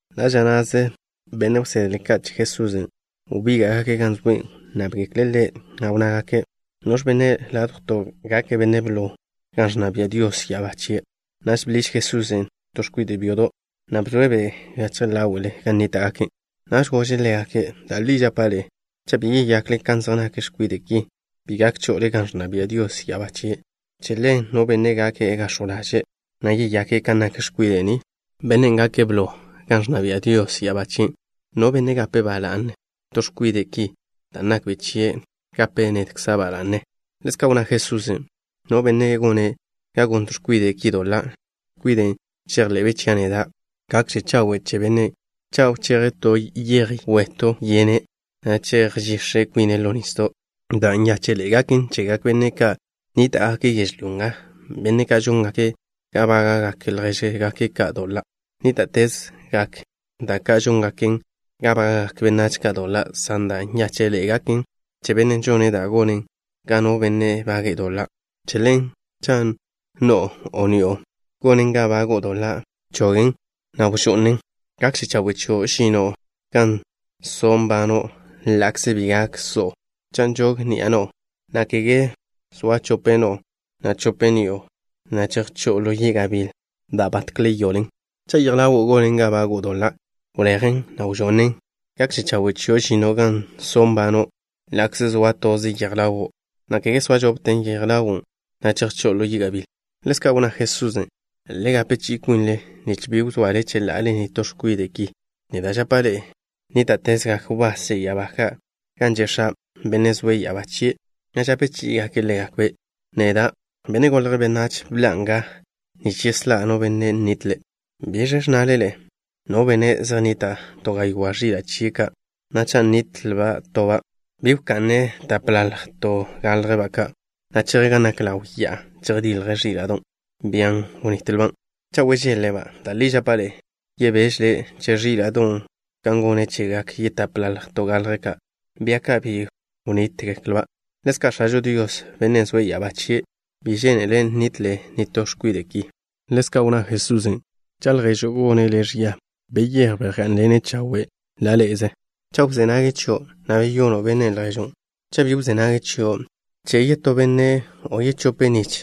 Ḻa' ža na'ze benne' wsedle ka' che Jesusen' wbíga'gake' gan zoe'. Wnnábgekle' Ḻe', na' wnnágake': —¿Noẕ benne' ládjwto' gake' benne' blo gan ẕnna bia' Dios ya'abá chie'? Naž bḻiž Jesusen' to x̱kwide' byodo', na' bzoe'-be' gachje ḻáwe'le gan nníta'gake'. Naž gože' ḻégake': —Da' li žapa' ḻe'e, cha' bi yeyakle kan zej nak x̱kwide' ki, bi gak cho'ole gan ẕnna bia' Dios ya'abá chie'. Che ḻen, no benne' gake' gax̱jw ḻaže', na' yeyake' kan nak x̱kwide' ni, bennen' gake' blo gan ẕnna bia' Dios ya'abá chien'. No benne' gape' ba la'ne to x̱kwide' ki dan' nakbe' chia', gape' nedkza' ba la'ne. Ḻezka' wnná Jesusen': —No benne' gone' ga gon to x̱kwide' ki doḻa', x̱kwiden' žejḻe'be' chia' neda', gakže chawe' che bennen' cha' wcheje' to yej wetw yene', na' chejžix̱je kwine' ḻo nisdo'. Da' nyáche'ḻe'e gaken chegak benne' ka' nníta'gake' yežlyó nga, benne' ka' žóngake' ga bága'gak ljéžgake' ka' doḻa'. Nníta'tezgak da' ka' žóngaken ga bága'gak benách ka' doḻa', san da' nyáche'ḻe'e gaken che bennen' žone' da' gonen ga no benne' bage'e doḻa'. ’Che ḻen, cha' no'o, o ni'o gonen ga bago'o doḻa', bchogen', na' wžo'nen'. Gakže chawe' chio' žino' gan so' nbano' ḻa'kze bi gak so'o, cha' nžog ni'a no'o, na' kege zoa chope no'o, na' chope ni'o, na' chejchó'o ḻo yi' gabíl da' batkle yoḻen. Cha' yej ḻawo' gonen ga bago'o doḻa', wlejen', na' wžo'nen'. Gakže chawe' chio' žino' gan so' nbano', ḻa'kze zoa toze yej ḻawo', na' kege zoa chope yej ḻawo', na' chejchó'o ḻo yi' gabíl. Ḻezka' wnná Jesusen': —Le gape chi'i kwinle nich bi wzoale cheḻa'ale nitó x̱kwide' ki. Neda' žapa' ḻe'e, nníta'tezgak wbás che ya'abá ka' gan že' X̱a', Bennen' zoe' ya'abá chie', na' žape chí'igake' ḻégakbe'. Neda', Benne' Golje' Benách, bḻa'a nga nich yeslá' no benne' nnitle'. ’¿Biẕ ẕnnale ḻe'e? No benne', zej nnita' to gaywá' ẕila' chie' ka', na' cha' nitle toba', ¿bi wka'ne' tapḻalj to galjba' ka', na' cheje' gan nak ḻaw ya'a, chejdilje' ẕíla'don', bian' wnitlba'? Cha' wežeḻ-le'-ba', da' li žapa' ḻe'e, yebéžele' che ẕíla'don' kan gone' chegak yetapḻalj to galjba' ka', bia ka' bi wnítgeklba'. Ḻezka' X̱ažo Dios, Bennen' zoe' ya'abá chie', bi žénele' nitle nitó x̱kwide' ki. Ḻezka' wnná Jesusen': —Cha' lježo' gone' le' ẕia, beyéj, bejgá'nḻene' chawe' ḻa' ḻé'ezele. Cha' wzé nage' chio', ba beyono' bennen' lježo'. Cha' bi wzé nage' chio', bche' yetó benne', o yechope' nich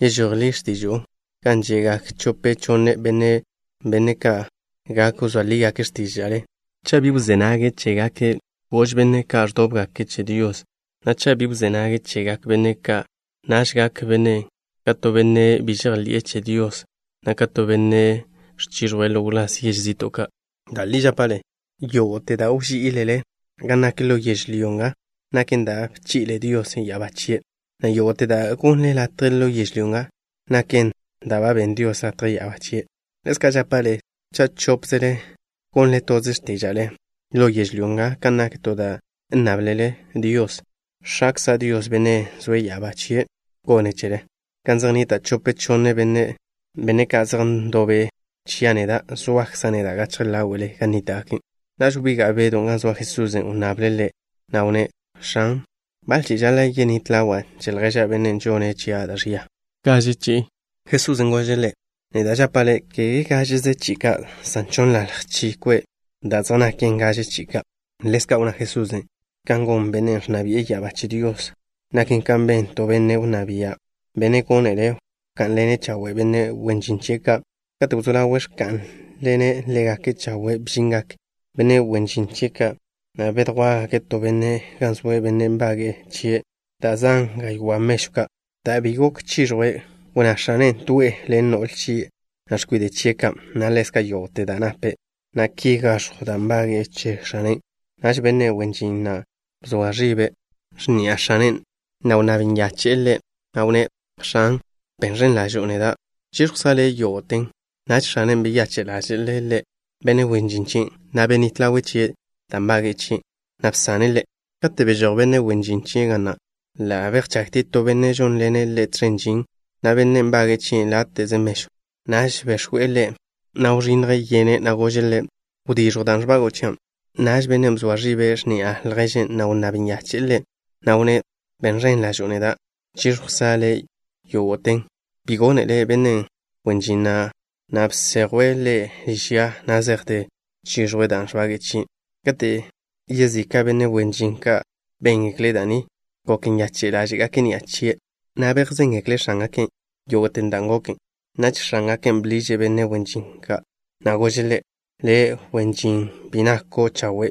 yežój ḻi x̱tižo'o gan že'gak chope chonne benne', benne' ka' gak wzóa ḻígake' x̱tíža'le. Cha' bi wzé nage' chégake', gož benne' ka' ẕdóbgake' che Dios, na' cha' bi wzé nage' chegak benne' ka', naž gak bennen' ḻo' le' ka to benne' bi žejḻi'e che Dios, na' ka to benne' ẕchiẕjwe' ḻo wláz yež zi'to'. ’Da' li žapa' ḻe'e, yógo'te da' wží'ilele gan nak ḻo yežlyó nga, naken da' ba bchi'le Dios ya'abá chie', na' yógo'te da' gonnle latje ḻo yežlyó nga, naken da' ba benn Dios latje ya'abá chie'. ’Ḻezka' žapa' ḻe'e, cha' chópzele gonle toze x̱tíža'le ḻo yežlyó nga kan nak to da' nnáblele Dios, X̱akza' Dios, Bennen' zoe' ya'abá chie', gonen' chele. Gan zej nnita' chope chonne benne', benne' ka' zej ndobe' chia' neda', zoakza' neda' gachje ḻáwe'le gan nníta'gake'. Naž wbiga' Bedw gan zoa Jesusen'. Wnnable' Ḻe', na' wnné': —X̱an, ¿baḻ chi'i žaḻa' yenít ḻawa' che lježa', bennen' žone' chia' da' ẕia? ¿Gaže chi'i ka'? Jesusen' gože' ḻe': —Neda' žapa' le', kege gážeze chi'i ka', san chonnḻalj chi kwe' da' zej naken gaže chi'i ka'. Ḻezka' wnná Jesusen': —Ka gon Bennen' ẕnna bi'e ya'abá che Dios naken kan ben to benne' wnná bia', benne' gónele' wká'nḻene' chawe' benne' wen žin chie' ka'. Kate' wzó ḻawe' ẕká'nḻene' ḻégake' chawe', bžingak benne' wen žin chie' ka', na' bedjwá'gake' to benne' gan zoe', benne' nbage'e chie' da' zan gaywá' mežw ka'. Dan' bi gok chiẕjwe', wnná x̱ane' to'e ḻe' ḻen no'le chie', na' x̱kwide' chie' ka', na' ḻezka' yógo'te da' nape', na' ki gaẕjw dan' nbage'e che x̱anen'. Naž benne' wen žin na' bzoa ẕibe' x̱ni'a x̱ane', na' wnnáb nyache'e ḻe', na' wnné': “X̱an, ben ẕen ḻažo'o neda'. Chíẕjwkza' le' yógo'ten.” Naž x̱anen' beyache' ḻáže'le' benne' wen žin chien', na' benít ḻawe' chie' dan' nbage'e chie', na' bsane' ḻe'. Kate' bežój benne' wen žin na' ga na', ḻa' bejchagtie' to benne' žónḻene' ḻe' tẕen žin, na' bennen' nbage'e chie' láte'ze mežw. Naž bex̱we' ḻe', na' wženje' yene', na' gože' ḻe': “Wdíẕjwte dan' ẕbago'o chia'.” Naž bennen' bzoa ẕibe' x̱ni'a lježen', na' wnnáb nyache'e ḻe', na' wnné': “Ben ẕen ḻažo'o neda'. Chíẕjwkza' le' yógo'ten.” Bi gónele benne' wen žin na', na' bsejwe' ḻe' liž ya na' zejte chiẕjwe' dan' ẕbage'e chie'. Kate' yezika' benne' wen žin ka' béngekle' da' ni, gok nyache' ḻáže'gake' ni'a chie', na' bejzéngekle' x̱ángake' yógo'te dan' goken. Naž x̱ángake' bḻiže' benne' wen žin na', na' gože' ḻe': “Le', wen žin bi nako' chawe'.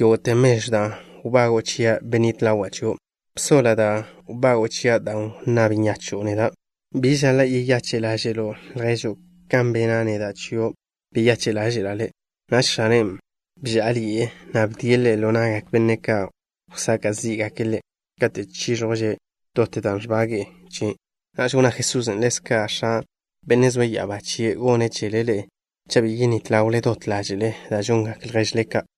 Yógo'te mežwn' dan' wbago'o chia' benít ḻawa' chio'. Bsoḻa' dan' wbago'o chia' dan' wnnáb nyacho'o neda'. ¿Bi žaḻa' yeyache' ḻáže'lo' lježo' kan bena' neda' chio', beyache' ḻáže'la' le'?” Naž x̱ane' bžá'aḻi'e, na' bdie' ḻe' ḻo na'gak benne' ka' wsaka' zí'gake' ḻe' kate' chíẕjwže' dot dan' ẕbage'e chie'. Naž wnná Jesusen': —Ḻezka' X̱a', Bennen' zoe' ya'abá chie', gone' chele ḻe'e cha' bi yenít ḻawle dot ḻáže'le da' žongak lježle ka'.